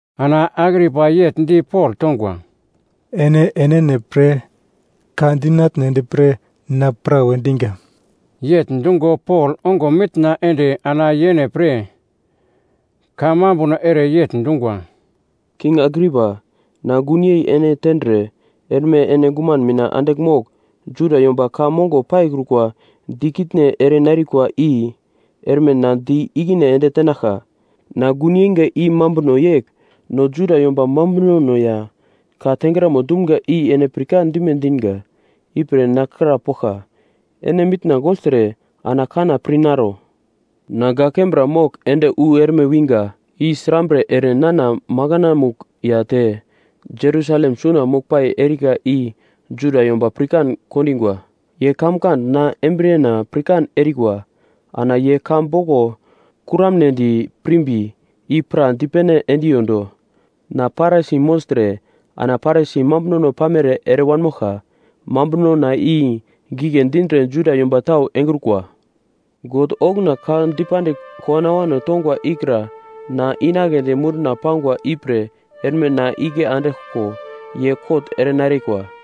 Ana Agripa yegl di Pol tongwa, “Ene enene pre ka dinatnedi pre na prawe dinga.” Yegl dungo Pol ongo mitna ende ana yene pre ka mambuno ere yegl dungwa, “King Agripa, na gunyei ene tendre erme ene guman mina andigl mogl, Juda yomba ka mongo paikrukwa dikitne erenarikwa i erme na di ikine ende tenaglka. Na gun yeinga i mambuno yegl: no Juda yomba mambunono ya ka tengramo dumga i ene pirkan dime dinga. Ipre na krapoglka, ene mitna gogltre ana kanna pir naro. “Na gak kembra mogl ende wu erme winga i srambre ere nana makanamugl ya te Jerusalem suna moglpai erika i Juda yomba pirkan kondingwa. Ye kamkand na embriyena pirkan erikwa, ana ye ka boglo kuramnedi pirmbi i pra dipene endiyodo. Na Parisi mogltre ana Parisi mambunono pamere ere wanmoglka. Mambunona i gigle dindre Juda yomba tau engrukwa. God okuna ka dipandigl kowano awano tongwa ikra na inagledi munduna pangwa ipre erme na igle andiglko ye kot erenarikwa.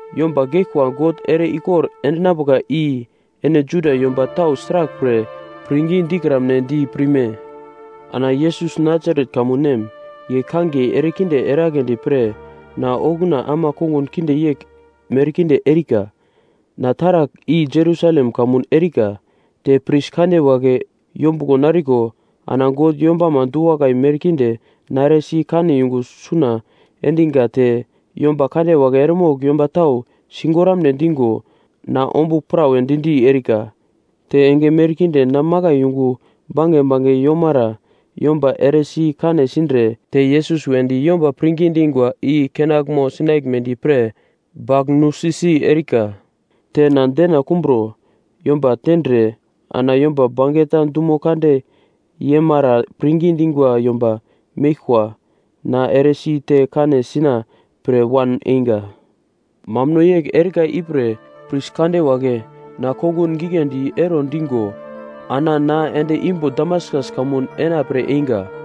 Yomba geglkwa God ere-ikor endinambuka i ene Juda yomba tau sraglpre pirngi dikramnedi pirme? “Ana Yesus Nasaret kamun nem, ye kangiye erekinde eragledi pre na okuna ama kongun kinde yegl merkinde erika. Na taragl i Jerusalem kamun erika. Te pris kande wagle yombuglo nariko ana God yombama du-wakai merkinde na eresi kane yungu suna endinga te yomba kande wagle eremogl yomba tau sigoramne dingo na ombugl prawe di-di erika. Te enge merkinde na makai yungu bange bange yomara yomba eresi kane sindre te Yesus wedi yomba pirngi dingwa i kenaglmo sinaglmedi pre bagl nusi-si erika. Te na dena kumbro yomba tendre ana yomba bangeta dumo kande yemara pirngi dingwa yomba meglkwa na eresi te kane sina pre wan einga. “Mambuno yegl erika ipre pris kande wagle na kongun giglendi ero digo ana na ende imbo Damaskas kamun enapre einga.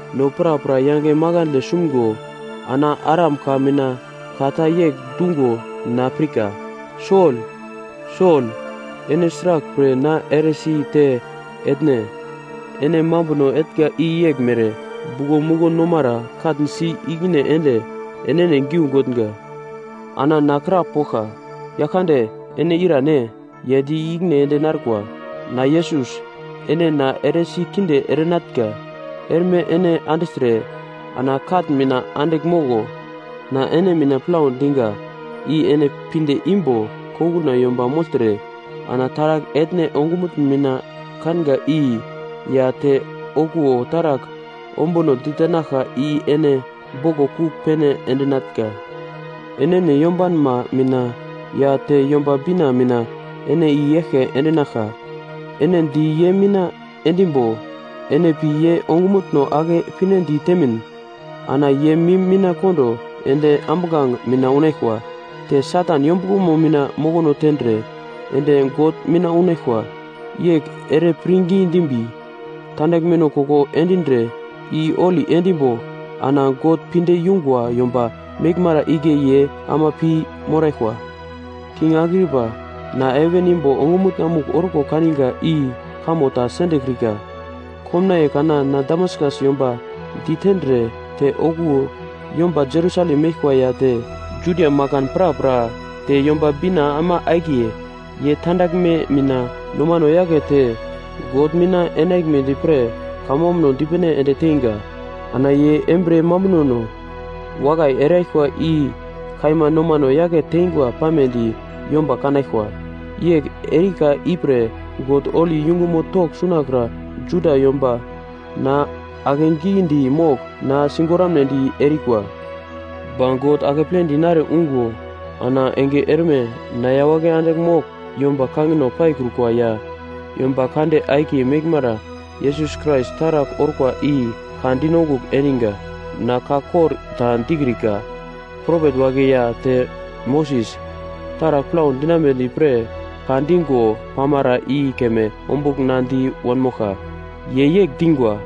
No prapra yange makandle sumgo ana Aram ka mina ka ta yegl dungo na pirka, ‘Sol! Sol! Ene sraglpre na eresi te etne? Ene mambuno etnga i yeglmere, buglo muglo nomara katn si ikine ende enene giu gotnga!’ “Ana na krapoglka, ‘Yaglkande, ene irane?’ “Ye di ikine ende narkwa, ‘Na Yesus, ene na eresi kinde erenatnga. Erme ene andigltre ana katn mina andigl moglo. Na ene mina plau dinga i ene pinde imbo konguna yomba mogltre ana taragl etne ongumutn mina kanga i ya te okuwo taragl ombuno ditenaglka i ene boglo kugl pene endinatnga. Enene yombanma mina ya te Yomba Bina mina ene i-eglke endinaglka. Ene di ye mina endimbo ene pi ye ongumutno ake pinedi temin ana ye mim mina kondo ende ambuglange mina unaglkwa. Te Satan yombuglomo mina mokono tendre ende God mina unaglkwa. Yegl ere pirngi dimbi tandaglmeno koko endindre i holi endimbo ana God pinde yungwa yomba meglmara igle ye ama pi moraglkwa.’ “King Agripa, na heven imbo ongumutna-mugl orko kaninga i kamo ta sendekrika. Komnaiye kana na Damaskas yomba ditendre te okuwo yomba Jerusalem meglkwa ya te Judia makan prapra, te Yomba Bina ama akiye, ye tandaglme mina nomano yakete God mina enaglmedi pre kamambuno dipene ende teinga. Ana ye embriye mambunono wakai eraglkwa i kaima nomano yake tengwa pamedi yomba kanaglkwa. Yegl erika ipre God holi yungumo togl sunakra Juda yomba na akegidi mogl na sigoramnedi erikwa. Ba God akeple dinare ungo ana enge erme na yawagle andigl mogl yomba kangino paikrukwa ya yomba kande akiye meglmara Yesus Krais taragl orkwa i ka dinongugl endinga. Na ka kor ta dikrika, propet wagle ya te Moses, taragl plau dinambedi pre ka dingo pamara i keme ombugl na di wanmoglka. Ye yegl dingwa,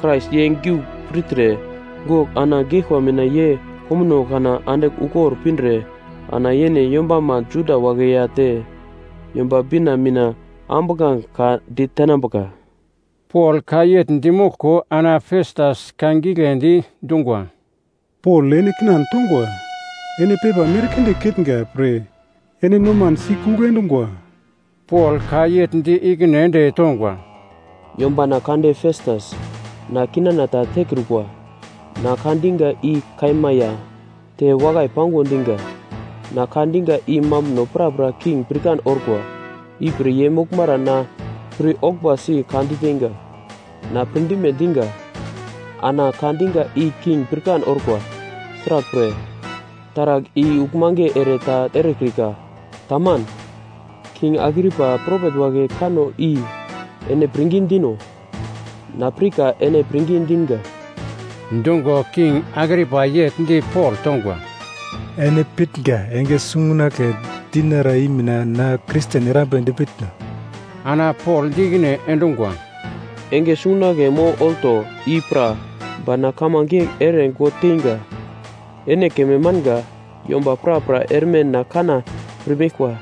‘Krais ye giugl pirtre, gogl ana geglkwa mina ye komuno kana andigl ukor pindre ana yene yombama Juda wagle ya te Yomba Bina mina ambuglange ka ditenambuka.’” Pol ka yegl dimoglko ana Festas ka giglendi dungwa, “Pol, ene kinan tongwa! Ene pepa merkinde ketnga pre ene noman sikugl endungwa.” Pol ka yegl di ikine ende tongwa, “Yombana kande Festas, na kinana ta tekrukwa. Na ka dinga i kaima ya te wakai pango dinga. Na ka dinga i mambuno prapra king pirkan orkwa, ipre ye moglmara na pir-oglmbasi ka diteinga. Na pirdime dinga ana ka dinga i king pirkan orkwa, sraglpre, taragl i uglmange ere ta erekrika, taman. King Agripa, propet wagle kanno i ene pirngi dino? Na pirka ene pirngi dinga.” Dungo, King Agripa yegl di Pol tongwa, “Ene pitnga enge sungunagle dinara i mina na Kristen erambedi pitno?” Ana Pol di ikine endungwa, “Enge sungunagle mo olto, i pra. Ba na kamange yegl ere God teinga, ene keme manga, yomba prapra erme na kanna pirmeglkwa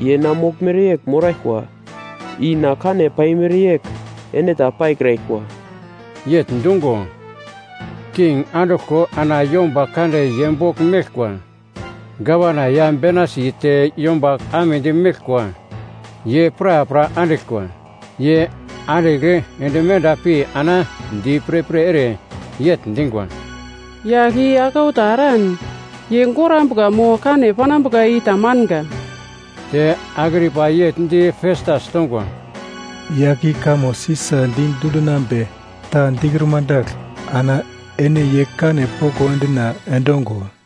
ye na moglmere yegl moraglkwa. I na kane paimere yegl ene ta paikraglkwa.” Yegl dungo, king anduglko ana yomba kande ye bogl meglkwa, gavana ya Benaisi te yomba amedi meglkwa ye prapra andiglkwa. Ye andigl ende menda pi ana di pirpir ere yegl dingwa, “Yagl i aglau ta eran ye gorambuka mo kane panambuka i ta manga.” Te Agripa yegl di Festas tongwa, “Yagl i kamo Sisa di dundinambe ta dikruma dagl ana ene ye kane poko endina endongo.”